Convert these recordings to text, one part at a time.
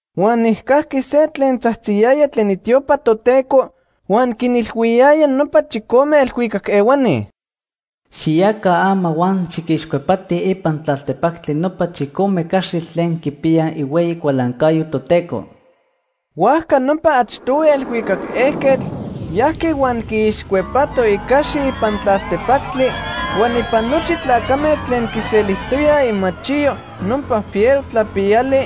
Huan nijcajqui se tlen tzajtziyaya tlen itiopa Toteco huan quinilhuiyaya nopa chicome elhuicac ehuani: “Xiyaca ama huan xiquixcuepatij ipan tlaltepactli nopa chicome caxitl tlen quipiyaj ihueyi cualancayo Toteco.” Huajca nopa achtohui elhuicac ejquetl yajqui huan quiixcuepato icaxi ipan tlaltepactli, huan ipan nochi tlacame tlen quiselijtoyaj imachiyo nopa fiero tlapiyali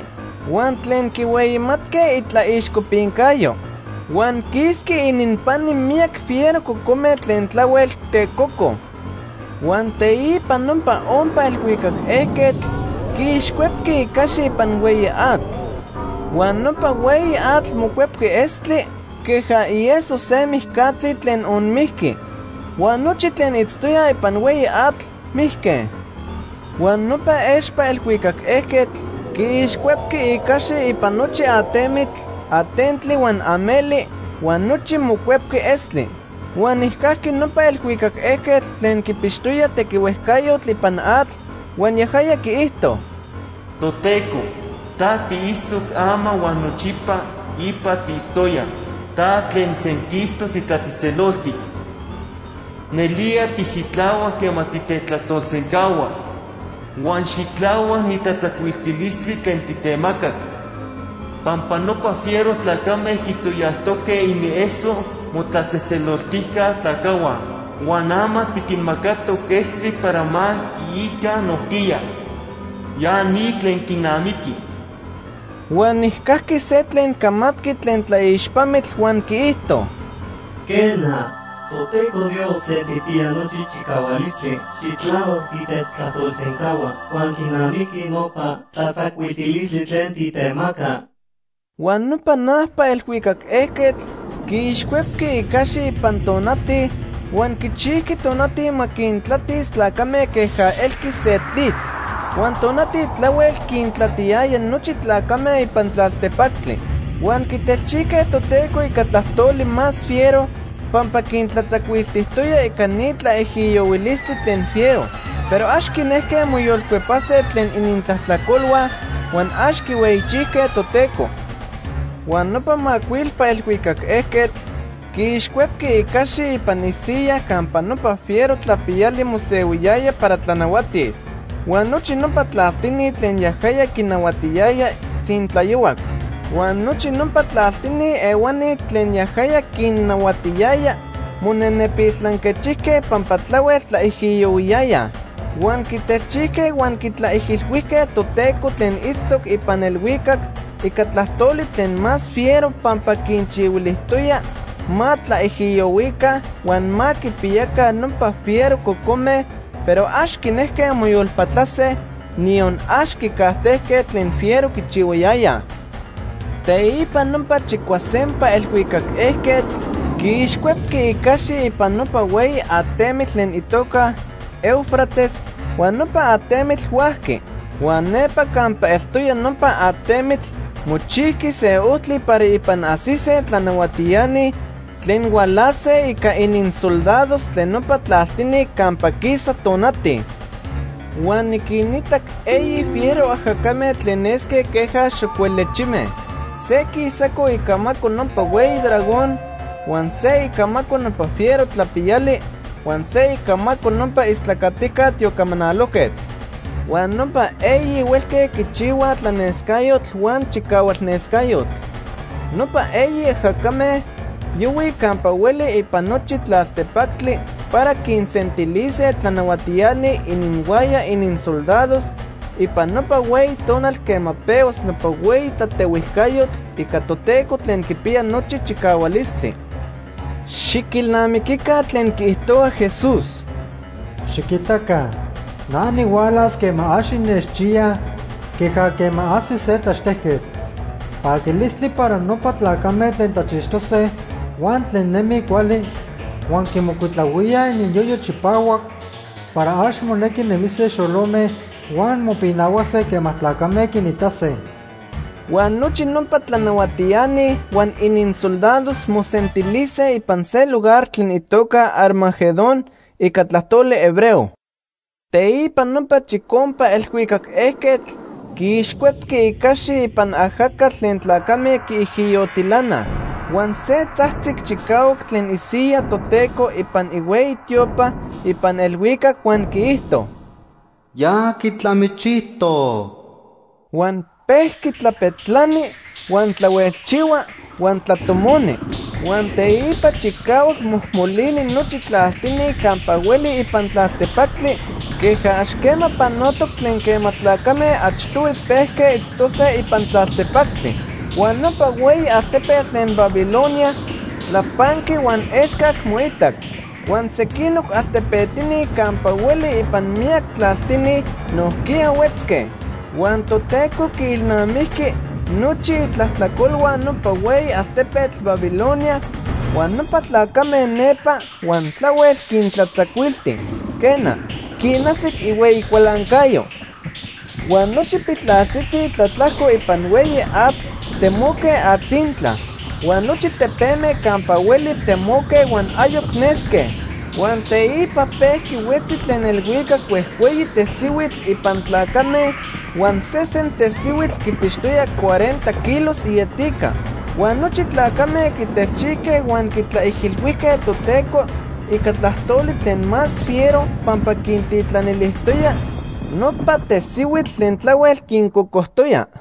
huan tlen quihueyimatque itlaixcopincayo. Huan quisqui ininpani miyac fiero cocome tlen tlahuel tecoco. Huan teipa nopa ompa elhuicac ejquetl quiixcuepqui icaxi ipan hueyi atl. Huan nopa hueyi atl mocuepqui estli, queja ieso se mijcatzi tlen onmijqui. Huan nochi tlen itztoyaj ipan hueyi atl mijque. Huan nopa expa elhuicac ejquetl quiixcuepqui icaxi ipan nochi atemitl, atentli huan ameli, huan nochi mocuepqui estli. Huan nijcajqui nopa elhuicac ejquetl tlen quipixtoya tequihuejcayotl ipan atl, huan yajaya quiijto: “Toteco, ta tiitztoc ama huan nochipa ipa tiitztoya. Ta tlen senquistoc titlatzejtzeloltic. Nelía tixitlahuac quema titetlajtolsencahua. Huan xitlahuac ni tlatzacuiltilistli tlen titemacac. Pampa nopa fiero tlacame quitoyajtoque inieso motlatzejtzeloltijca tlacajhua, huan ama tiquinmacatoc estli para ma quiica nojquiya. Ya ni tlen quinamiqui.” Huan nijcajqui se tlen camatqui tlen tlaixpamitl huan quiijto: “Quena, Toteco Dios Tlen Tijpiya Nochi Chicahualistli, xitlahuac titetlajtolsencahua huan quinamiqui nopa tlatzacuiltilistli tlen titemaca.” Huan nopa najpa elhuicac ejquetl quiixcuepqui icaxi ipan tonati huan quichijqui tonati ma quintlatis tlacame queja elqui se tlitl. Huan tonati tlahuel quintlatiyaya nochi tlacame ipan tlaltepactli. Huan quitelchijque Toteco ica tlajtoli más fiero pampa quintlatzacuiltijtoya ica ni tlaijiyohuilistli tlen fiero. Pero ax quinejque moyolcuepase tlen inintlajtlacolhua huan ax quihueyichijque Toteco. Huan nopa macuilpa elhuicac ejquetl quiixcuepqui icaxi ipan isiyaj campa nopa fiero tlapiyali mosehuiyaya para tlanahuatis. Huan nochi nopa tlaltini tlen yajaya quinahuatiyaya tzintlayohuac. Huan nochi nopa tlaltini ehuani tlen yajaya quinnahuatiyaya monenepil tlanquechijque pampa tlahuel tlaijiyohuiyayaj. Huan quitelchijque huan quitlaijilhuijque Toteco tlen itztoc ipan elhuicac ica tlajtoli tlen más fiero pampa quinchihuilijtoya ma tlaijiyohuica huan ma quipiyaca nopa fiero cocome, pero ax quinejque moyolpatlase, niyon ax quicajtejque tlen fiero quichihuayayaj. Teipa nopa chicuasempa elhuicac ejquetl quiixcuepqui icaxi ipan nopa hueyi atemitl tlen itoca Éufrates, huan nopa atemitl huajqui. Huan nepa campa eltoya nopa atemitl mochijqui se ojtli para ipan ajsise tlanahuatiani tlen hualase ica ininsoldados tlen nopa tlaltini campa quisa tonati. Huan niquinitac eyi fiero ajacame tlen nesque queja xocuelechime. Se quisaco icamaco nopa hueyi dragón, huan se icamaco nopa fiero tlapiyali, huan se icamaco nopa istlacatijca tiocamanalojquetl. Huan nopa eyi huelque quichihuaj tlanescayotl huan chicahualnescayotl. Nopa eyi ajacame yohuij campa hueli ipan nochi tlaltepactli para quinsentilise tlanahuatiani ininhuaya ininsoldados ipan nopa hueyi tonal quema pehuas nopa hueyi tlatehuijcayotl ica Toteco Tlen Quipiya Nochi Chicahualistli. Xiquilnamiquica tlen quiijtohua Jesús: “Xiquitaca na nihualas quema ax innechchiyaj queja quema ajsi se tlaxtejquetl. Paquilistli para nopa tlacame tlen tlachixtose huan tlen nemij cuali, huan quimocuitlahuíaj ininyoyo chipahuac para ax monequi nemise xolome, huan mopinahuase quema tlacame quinitase.” Huan nochi nopa tlanahuatiani huan ininsoldados mosentilise ipan se lugar tlen itoca Armagedón ica tlajtoli hebreo. Teipa nopa chicompa elhuicac ejquetl quiixcuepqui icaxi ipan ajacatl tlen tlacame quiijiyotilanaj. Huan se tzajtzic chicahuac tlen isiyaj Toteco ipan ihueyi tiopa ipan elhuicac huan quiijto: “Ya quitlamichijtoc.” Huan pejqui tlapetlani, huan tlahuelchihua, huan tlatomoni. Huan teipa chicahuac mojmolini nochi tlaltini campa hueli ipan tlaltepactli queja ax quema panotoc tlen quema tlacame achtohui pejque itztose ipan tlaltepactli. Huan nopa hueyi altepetl tlen Babilonia tlapanqui huan excac moitac. Huan sequinoc altepetini campa hueli ipan miyac tlaltini nojquiya huetzque. Huan Toteco quiilnamijqui nochi itlajtlacolhua nopa hueyi altepetl Babilonia huan nopa tlacame nepa, huan tlahuel quintlatzacuilti. Quena, quinajsic ihueyi cualancayo. Huan nochi piltlaltzitzi tlatlajco ipan hueyi atl temoque atzintla. Huan nochi tepeme campa hueli temoque huan ayoc nesque. Huan teipa pejqui huetzi tlen elhuicac huejhueyi tesihuitl ipan tlacame huan sesen tesihuitl quipixtoya cuarenta kilos ietica. Huan nochi tlacame quitelchijque huan quitlaijilhuijque Toteco ica tlajtoli tlen más fiero pampa quintitlanilijtoya nopa tesihuitl tlen tlahuel quincocojtoya.